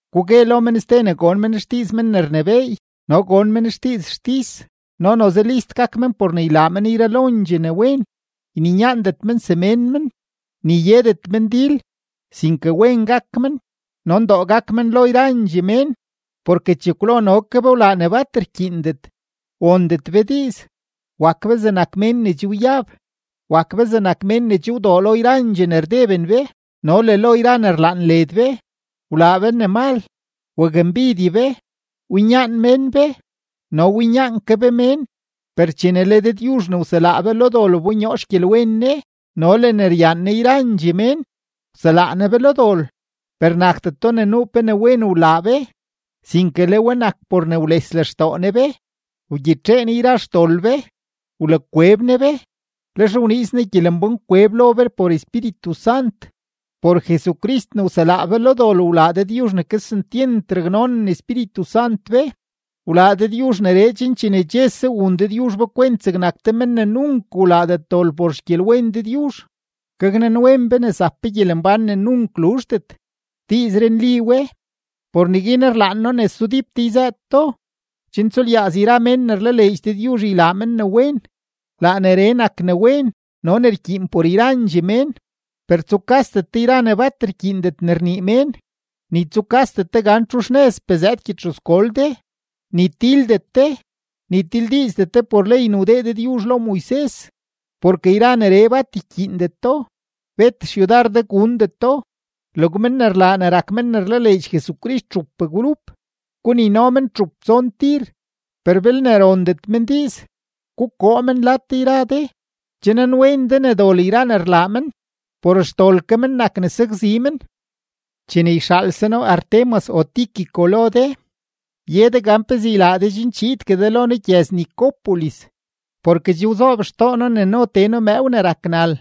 Guguegue lo men ste ne gon men xdiiz men ne rnebééy no gon men xdiiz xtis no noze list gak men por ne ylaa men yralondxee ne wen, yninyaandet men semén men, ni yedet men dil, sinke wen gak men no ndoo gak men lo yrandxee mén. Porke chekwlo no ke be wlaa ne bat rkyiindet, wondet be diiz, wak be zegnak mén ne che wyab, wak be zegnak mén ne che wdoo lo yrandxee ne rdeben be no le lo yra ne rlaan led be, wlaa be ne mal, wakmbidye be, winyaan mén be no winyaan ke be mén. Per chene le Dëdyuzh ne wselaa be lo dol wbonyoo xgyelwen Ne no le ne ryaan Ne yrandxee mén, wselaa Ne be lo dol, per nakdeto ne nuu pe ne wen wlaa be, sinke le we nak por ne wles lextoo Ne be. Wgyitxee Ne yra xdol be, wlakweb Ne be, lex wniiz Ne gyelembán kweb lo be por Espíritu Sant. Por Jesucrist ne wselaa be lo dol wlaa Dëdyuzh ne kesentyent raknonen Espíritu Sant be. Wlaa Dëdyuzh neree chen chene chese wun Dëdyuzh be kwent zegnak te men ne nunk wlaadet dol por xgyelwen Dëdyuzh, gaknanwen be ne zap be gyelembán ne nunk luzhdet. Diizree nli we; por neguin rlaan noo ne sudíp de yzëët do, chen tsulyaaz yra mén ne rlaleedx Dëdyuzh ylaa men ne wen. Laa neree nak ne wen no ne rkyiin por yrandxee mén. Per tsukasdet de yra ne bat rkyiindet ne rnii mén, ni tsulyaazdet de gan txu xnëzpee zëëd gyedxuzgol de, ni tildet de, ni tildiizdet de por ley ne wdee Dëdyuzh lo Moises. Porke yra neree bat ykyiindeto, bet xyudar de gundeto. Log men ne rlaa ne rak men ne rlaleedx Jesucrist txup grup, gunino men txup tson tir, per belne rondet men diiz, gukoo men lad de yra de. Che nanwen de ne dol yra ne rlaa men; por xdol ke men nak ne sakzi men. Chene yxaalse noo Artemas o Tíquico lo de, ye de gan pezee ylaa de chen chiidgue de lo noo gyëz-Nicópolis, porke che wzoob xtoo noo ne no tee noo mëëw ne rak nal.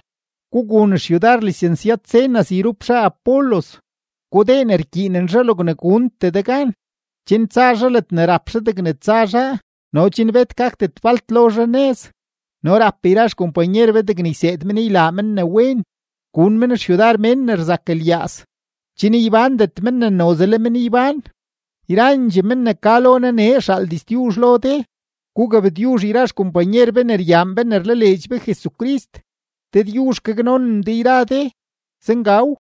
Gugun xyudar lisensyad-Zenas yrup zhaa Apolos, gudee ne rkyiinen zhaa logne guntee de gan, chen tsa zhaa ledne rap zhaa degne tsa zhaa no chen bet gakdet falt lo zhaa nëz. No rap yra xkompanyer be degne yseed men ylaa men ne wen, gun men xyudar mén ne rzak lyaaz, chen ybándet men ne noze le men ybán. Yrandxee men ne ka lo noo nee rxaal diztyuzh lo de. Gugabtyuzh yra xkompanyer be ne ryaan be ne rlaleedx be Jesucrist. Dëdyuzh gaknonen de yra de. Zengaw.